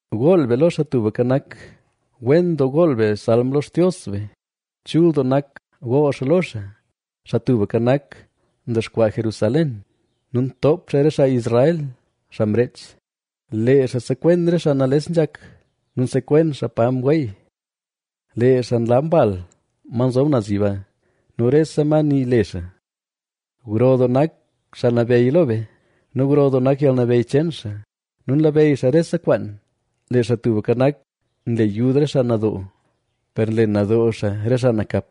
Gool be lo Xaa Tubka Nak. Wen doo gool be salm lo Xtios be; chul doo nak gool xaa lo xaa. Xaa Tubka Nak, ndexkwaa Jerusalén; nu ntoop xaa re xaa Israel, xaa mreech. Lee xaa nsekwen re xaa nales nzhak nu nsekwen xaa pa nweey. Lee xaa nlab mbal, ma nzob naz yiba, nu rese ma nii le xaa. ¡Gro doo nak Xaa Nabeyy lo be nu gro doo nak yalnabeyy cheen xaa nu nlabeyy xaa rese kwaan! Lee Xaa Tubka Nak, nle yud re xaa nadoo, per nle nadoo xaa re xaa nakap.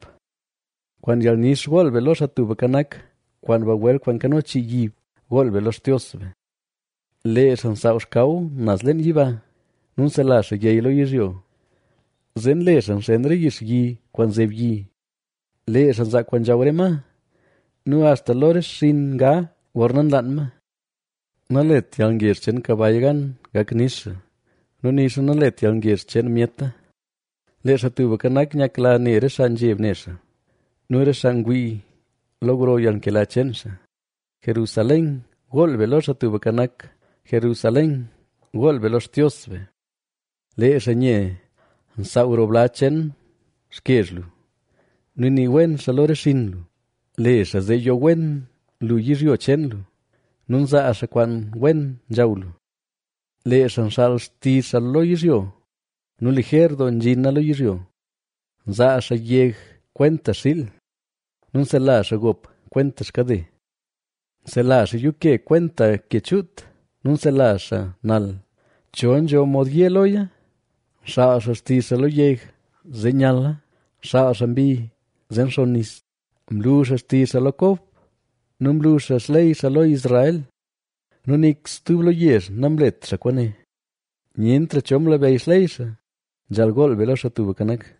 Kwaan yalnix gool be lo Xaa Tubka Nak, kwaan bagwel kwaan nkano chii yib gool be lo Xtios be. Lee xaa nsaaw xkaw naz leen yiba, nu nsela xaa yey lo yizhyo, zee nle xaa nxen re yix yi kwaan nzeb yi. Lee xaa nzaa kwaan nzhaw re ma, nu axta lo re xinn nga gorna nlaan ma. Nalet yalngezh cheen kabay gan gak nix xaa nu nixa nalet yalngezh cheen myeta. Lee Xaa Tubka Nak, nyakla ne re xaa nzheb ne xaa, nu re xaa ngwii lo gro yalnkela cheen xaa. Jerusalén, gool be lo Xaa Tubka Nak; Jerusalén, gool be lo Xtios be. Lee xaa nye nsaaw roo bla cheen xkezh lu nu nii wen xaa lo re xinn lu. Le xaa zee yo wen lu yizhyo cheen lu nu nzaa xaa kwaan wen nzhaw lu. Lee xaa nxaal xtizh xaa lo yizhyo nu lijer doo nzhina lo yizhyo. Nzaa xaa yeg kwenta xiil, nu nsela xaa gop kwenta xkade. Nsela xaa yuuke kwenta ke chuut; nu nsela xaa nal, ¿cho nzho mod ye loya? Nxaal xaa xtizh xaa lo yeg, zee nyala; nxaal xaa mbi, zee nxonn nis. Mlu xaa xtizh xaa lo Kob nu mlu xaa xley xaa lo Israel. Nu nik stub lo yezh namlet xaa kwaane; nyentra cho mlabeyy xley xaa. ¡Nzhaal gool be lo Xaa Tubka Nak!